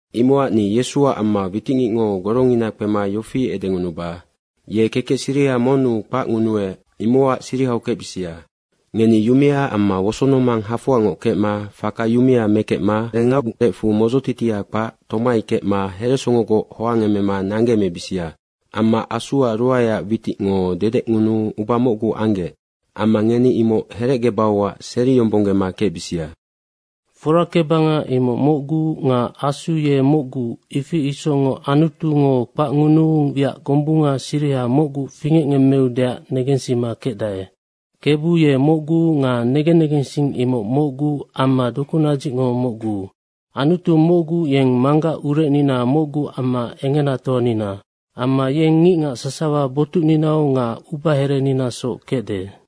Imocac ni Yesuac amma witicngicngo gorongina kpema yofi edengunuba, ye kekec siriha monnu kpacngunuec, imocac sirihau kecbisia. Ngeni yumea amma wosonomang hafoangoc kecma faka yumea mekecma ubangerecfu modzotitia kpac tomai kecma heresongogoc hoangemema nanggeemebisia. Amma Asuac ruaeac witicngo dedecngunuu uba mocgu anggec. Amma ngeni imoc herecgebauac seriyombonggema kecbisia. Forakebanga imoc mocgu nga Asu ye mocgu, ifi isocngoc Anutungo kpacngunuu wiac gombunga siriha mocgu fingecngemmeudeac negensima kecdae. Kebu ye mocgu nga negen negensing imoc mocgu amma dokunadzicngo mocgu. Anutu mocgu, yeng Manggac urecnina mocgu amma engenatoanina. Amma yeng ngicngac sasawa botucninau nga ubahereninasoc kecde.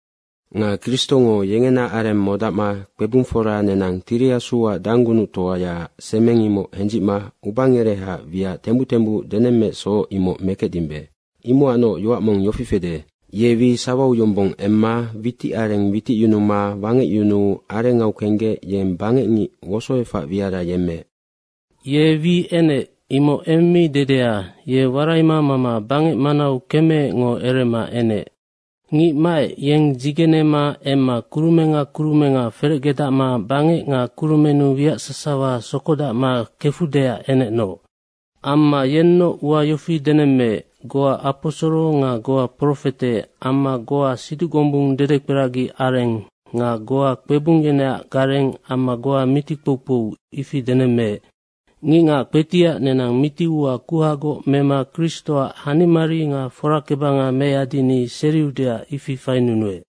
Nga Kristongo yengena areng modacma kpebungfora nenang Tiri Asuac danggunuctoyaac semeng, imoc hendzicma ubangerehaac wiac tembuc tembuc denemmeecsoc, imoc mekecdimbe. Imocacnoc yoac mong yofi fede, “Ye wi sawau yombong emma witicareng witicyunuma wangecyununa arengau kenggec yeng bangecngic wosoefac wiara yemmeec.” “Ye wi enec.” Imoc eng mi dedea, ye waraima mama bangec manau kemeecngo erema enec. Ngic maec, yeng dzigenema emma kurumenga kurumenga ferecgedacma bangec nga kurumennu wiac sasawa sokodacma kefudeac enecnoc. Amma yennoc ua yofi denemmeec, goa aposoro nga goa profete amma goa siduc gombung dedekperagi areng nga goa kpebung yeneac gareng amma goa miti kpoukpou, ifi denemmeec. Ngicngac kpetiac nenang miti ua kuhagoc mema Kristoac hanimari nga forakebanga meyadini seriudeac ifi fainunuec.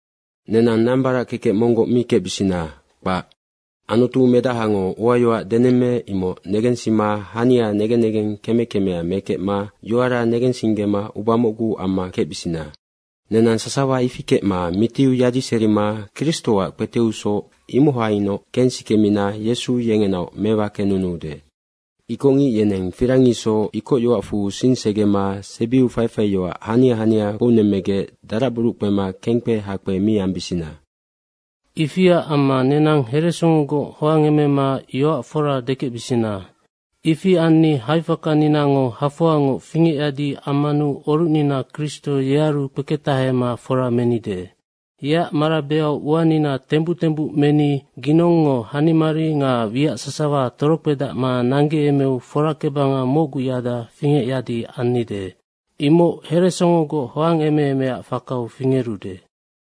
Nenang nambarac kekec monggoc mi kecbisina, kpac. Anutu medahango uayoac denemmeec, imoc negensima hania negen negeng keme kemea mekecma yoara negensinggema uba mocgu amma kecbisina. Nenang sasawa ifi kecma mitiu yadiserima Kristoac kpeteusoc, imohainoc kensikemina Yesu yengenaoc mewakenunuude. Ikocngic yeneng firang isoc ikocyoacfu sing segema sebiu faifaiyoac hania hania kpounemmegec daracburuc kpema kengkpe hakpe mi ambisina. Ifiac amma nenang heresongogoc hoangemema yoac fora dekecbisina. Ifi anni haifakaninango hafoangoc fingecyadi ammanu orucnina Kristo yearu kpeketahema fora menide. Yeac marabeau uanina tembuc tembuc meni, ginongngo hanimari nga wiac sasawa torokpedacma nanggeemeu forakebanga mocguyada fingecyadi annide. Imoc heresongogoc hoangemeemeac fakau fingerude.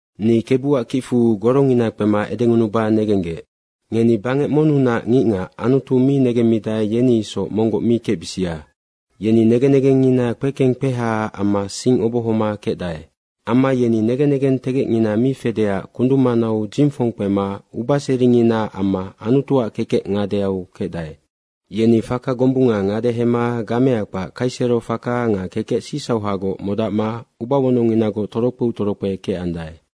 Ni Kebuac kicfu gorongina kpema edengunuba negenggec: Ngeni, bangec monnunac ngicngac Anutu mi negemmidae, yeni isoc monggoc mi kecbisia. Yeni negen negengngina kpekeng kpehaac amma sing obohoma kecdae. Amma yeni negen negentegecngina mi fedeac kundung manau dzingfong kpema ubaseringinaac amma Anutuac kekec ngadeau kecdae. Yeni faka gombunga ngadehema gamea kpac kaisero faka nga kekec sicsauhagoc modacma ubawonongnginagoc torokpeu torokpe kecandae.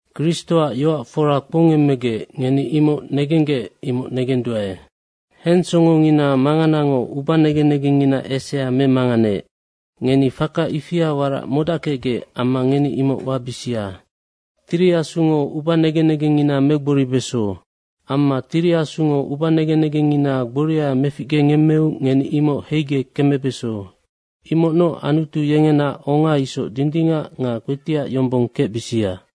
Kristoac yoac fora kpoungemmegec, ngeni imoc negenggec, imoc negenduae. Hensongongina manganango ubanegen negengngina esea memanganeec. Ngeni faka ifia warac modackecgec amma ngeni imoc wabisia. Tiri Asungo ubanegen negengngina megboribeso. Amma Tiri Asungo ubanegen negengngina gboria meficgengemmeu ngeni imoc heigec kemebeso, imocnoc Anutu yengena onga isoc dindingac nga kpetiac yombong kecbisia.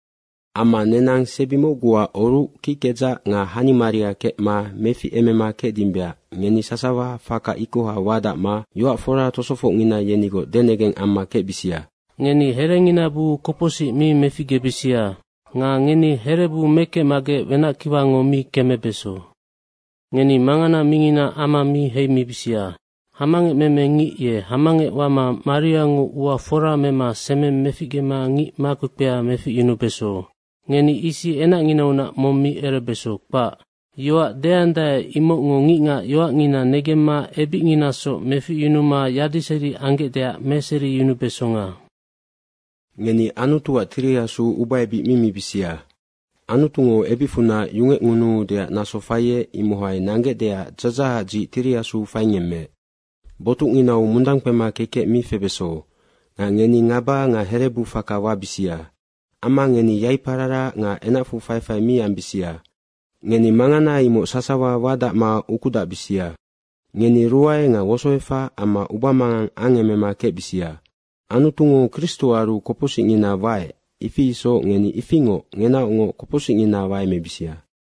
Amma nenang sebi mocguac oruc kickedzac nga hanimaria kecma meficemema kecdimbeac ngeni sasawa faka ikoha wadacma yoac fora tosofocngina yenigoc denegeng amma kecbisia. “Ngeni herengina buu kopocsic mi meficgebisia.” Nga ngeni herebu mekecmagec wenackiwango mi kemebeso. Ngeni mangana mingina ama mi heimibisia. Hamangecmeme ngic ye hamangec wama mariango ua fora mema semeng meficgema ngic makpekpea meficyunubeso. Ngeni isi enacnginaunac mong mi erebeso, kpac. Yoac deandae, imocngo ngicngac yoacngina negemma ebicnginasoc meficyunuma yadiseri anggecdeac meseriyunubesonga. Ngeni Anutuac Tiri Asu ubaebic mi mibisia. Anutungo ebicfunac yungecngunuudeac naso faiec, imohai nanggecdeac dzadzahacac dzic Tiri Asu faingemmeec. Botucnginau mundang kpema kekec mi febeso nga ngeni ngaba nga herebu faka wabisia. Amma ngeni yaipararac nga enacfu faifai mi ambisia. Ngeni mangana imoc sasawa wadacma ukudacbisia. Ngeni ruae nga wosoefac amma ubamangang angemema kecbisia. Anutungo Kristoaru kopocsicngina waec, ifi isoc ngeni ifingoc ngenaocngoc kopocsicngina waemebisia.